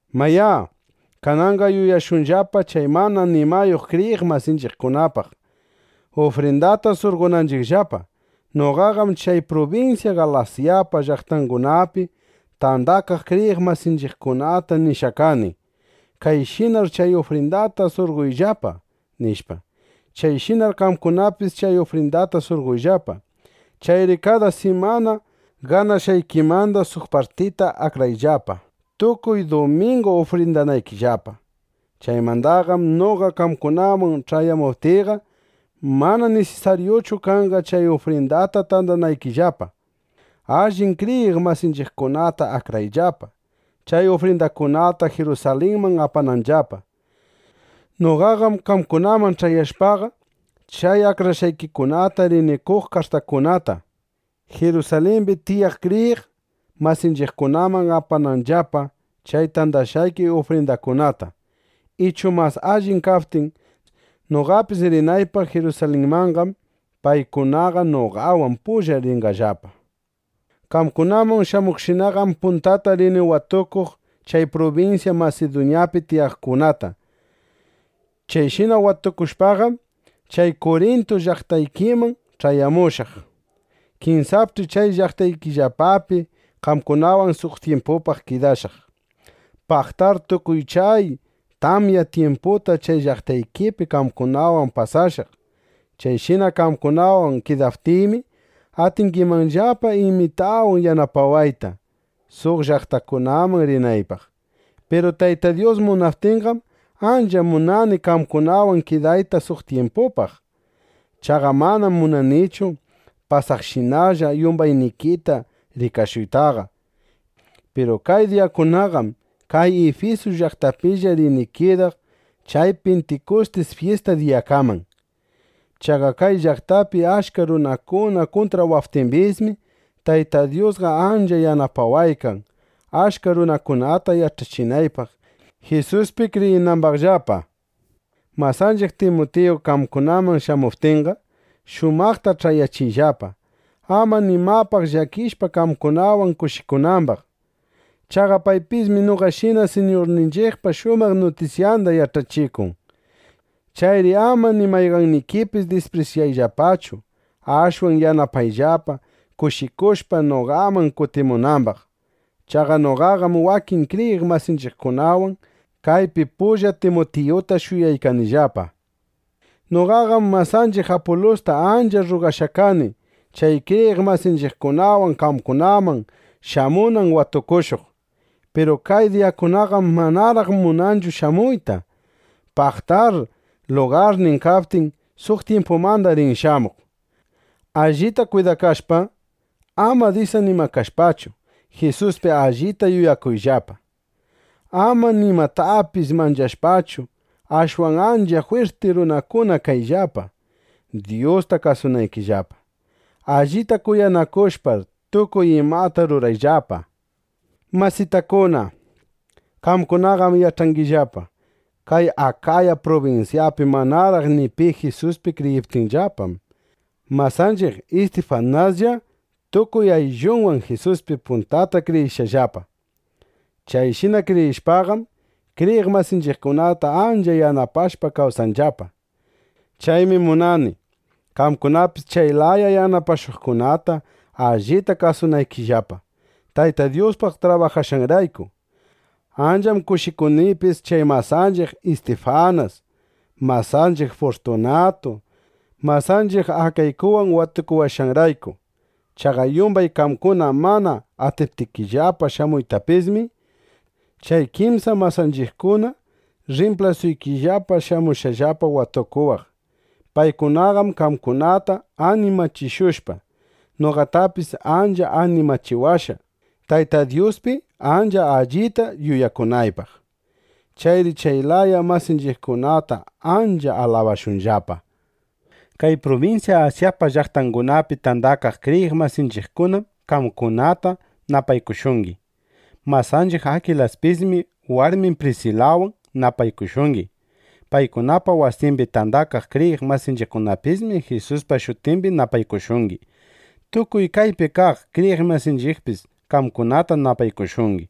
Mayá, kananqa yuyashunllapa chay mana nimayuq kriyiq masinchiqkunapaq, ufrindata surqonanchiqllapa. Noqaqam chay prubinsya Galasyapa llaqtangunapi tandakaq kriyiq masinchiqkunata nishqa kani: “Kayshinar chay ufrindata surqoyllapa”, nishpa. Chayshinar qamkunapis chay ufrindata surqoyllapa. Chayri kada simana ganashqaykimanda suq partita akrayllapa, tukuy dumingu ufrindanaykillapa. Chaymandaqam noqa qamkunaman ch'ayamuptiyqa, manana nisisaryuchu kanqa chay ufrindata tandanaykillapa. Allin kriyiq masinchiqkunata akrayllapa, chay ufrindakunata Jirusalinman apananllapa. Noqaqam qamkunaman ch'ayashpaqa, chay akrashqaykikunata rini qoq kartakunata, Jirusalimbi tiyaq kriyiq masinchiqkunaman apananllapa chay tandashqayki ufrindakunata. Ichu mas alli kaptin, noqapis rinaypaq Jirusalinmanqam, paykunaqa noqawan pulla rinqallapa. Qamkunaman shamuqshinaqam puntata rini watukuq chay prubinsya Masiduñapi tiyaqkunata. Chayshina watukushpaqam, chay Kurintu llaqtaykiman ch'ayamushaq. Kinsapch'i chay llaqtaykillapapi qamkunawan suq tyimpupaq kidashaq. Paqtar tukuy chay tamya tyimputa chay llaqtaykipi qamkunawan pasashaq. Chayshina qamkunawan kidaptiymi, atingimanllapa imitawan yanapawayta, suq llaqtakunaman rinaypaq. Piru Tayta Dyus munaptinqam, ancha munani qamkunawan kidayta suq tyimpupaq. Chaqa manam munanichu pasaqshinalla yumbaynikita rikashuytaqa. Piru kay diyakunaqam kay Ifisu llaqtapilla rini kidaq chay Pintikustis fyista diyakaman. Chaqa kay llaqtapi achka runakuna kuntrawaptimbismi, Tayta Dyusqa ancha yanapawaykan, achka runakunata yach'achinaypaq, Jisuspi kriyinambaqllapa. Masanchiq Timutiyu qamkunaman shamuptinqa, shumaqta ch'ayachiyllapa, ama nimapaq llakishpa qamkunawan kushikunambaq. Chaqa paypismi noqashina Siñurninchiqpa shumaq nutisyanda yach'achikun. Chayri ama ni mayqannikipis disprisyayllapachu. Ashwan yanapayllapa, kushikushpa noqaman kutimunambaq. Chaqa noqaqam wakin kriyiq masinchiqkunawan kaypi pulla Timutiyuta shuyaykanillapa. Noqaqam masanchiq Apulusta ancha rrugashqa kani, chay kriyiq masinchiqkunawan qamkunaman shamunan watukushuq. Piru kay diyakunaqam manaraq munanchu shamuyta. Paqtar lugarnin kaptin, suq tyimpumanda rin shamuq. Allita kwidakashpa, ama disanimakashpachu, Jisuspi allita yuyakuyllapa. Ama nimatapis manchashpachu, ashwan ancha jwirti runakuna kayllapa, Dyusta kasunaykillapa. Allita kuyanakushpar, tukuy imata rurayllapa. Masitakuna, qamkunaqam yach'angillapa: Kay Akaya prubinsyapi manaraq ni pi Jisuspi kriyiptinllapam, masanchiq Istifanaslla tukuy ayllunwan Jisuspi puntata kriyishqallapa. Chayshina kriyishpaqam, kriyiq masinchiqkunata ancha yanapashpa kawsanllapa. Chaymi munani, qamkunapis chay laya yanapashuqkunata allita kasunaykillapa, Tayta Dyuspaq trabajashqanrayku. Ancham kushikunipis chay masanchiq Istifanas, masanchiq Furtunatu, masanchiq Akaykuwan watukuwashqanrayku. Chaqa yumbay qamkuna mana atiptikillapa shamuytapismi, chay kimsa masanchiqkuna rrimplasuykillapa shamushqallapa watukuwaq. Paykunaqam qamkunata animachishushpa, noqatapis ancha animachiwashqa, Tayta Dyuspi ancha allita yuyakunaypaq. Chayri chay laya masanchiqkunata ancha alabashunllapa. Kay prubinsya Asyapa llaqtangunapi tandakaq kriyiq masinchiqkunam qamkunata napaykushungi. Masanchiq Akilaspismi warmin Prisilawan napaykushungi. Paykunapa wasimbi tandakaq kriyiq masinchiqkunapismi Jisuspa shutimbi napaykushungi. Tukuy kaypi kaq kriyiq masinchiqpis qamkunata napaykushungi.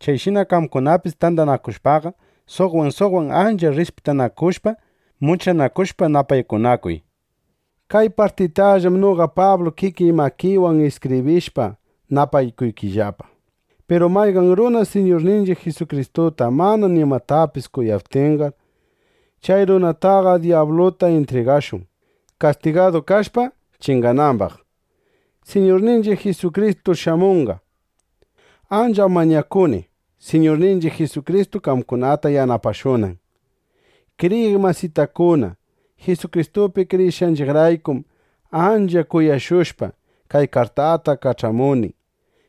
Chayshina qamkunapis tandanakushpaqa, suqwan suqwan ancha rrispitanakushpa, muchanakushpa napaykunakuy. Kay partitallam noqa Pablu kikiy makiywan iskibrishpa napaykuykillapa. Piru mayqan runa Siñurninchiq Jisukristuta mana nimatapis kuyaptinqar, chay runataqa dyabluta intrigashun, kastigadu kashpa, chinganambaq. ¡Siñurninchiq Jisukristu shamunqa! Ancham mañakuni, Siñurninchiq Jisukristu qamkunata yanapashunan. Kriyiq masitakuna, Jisukristupi kriyishqanchiqraykum ancha kuyashushpa, kay kartata kach'amuni.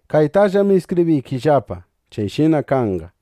(Kaytallam iskibriykillapa.) Chayshina kanqa.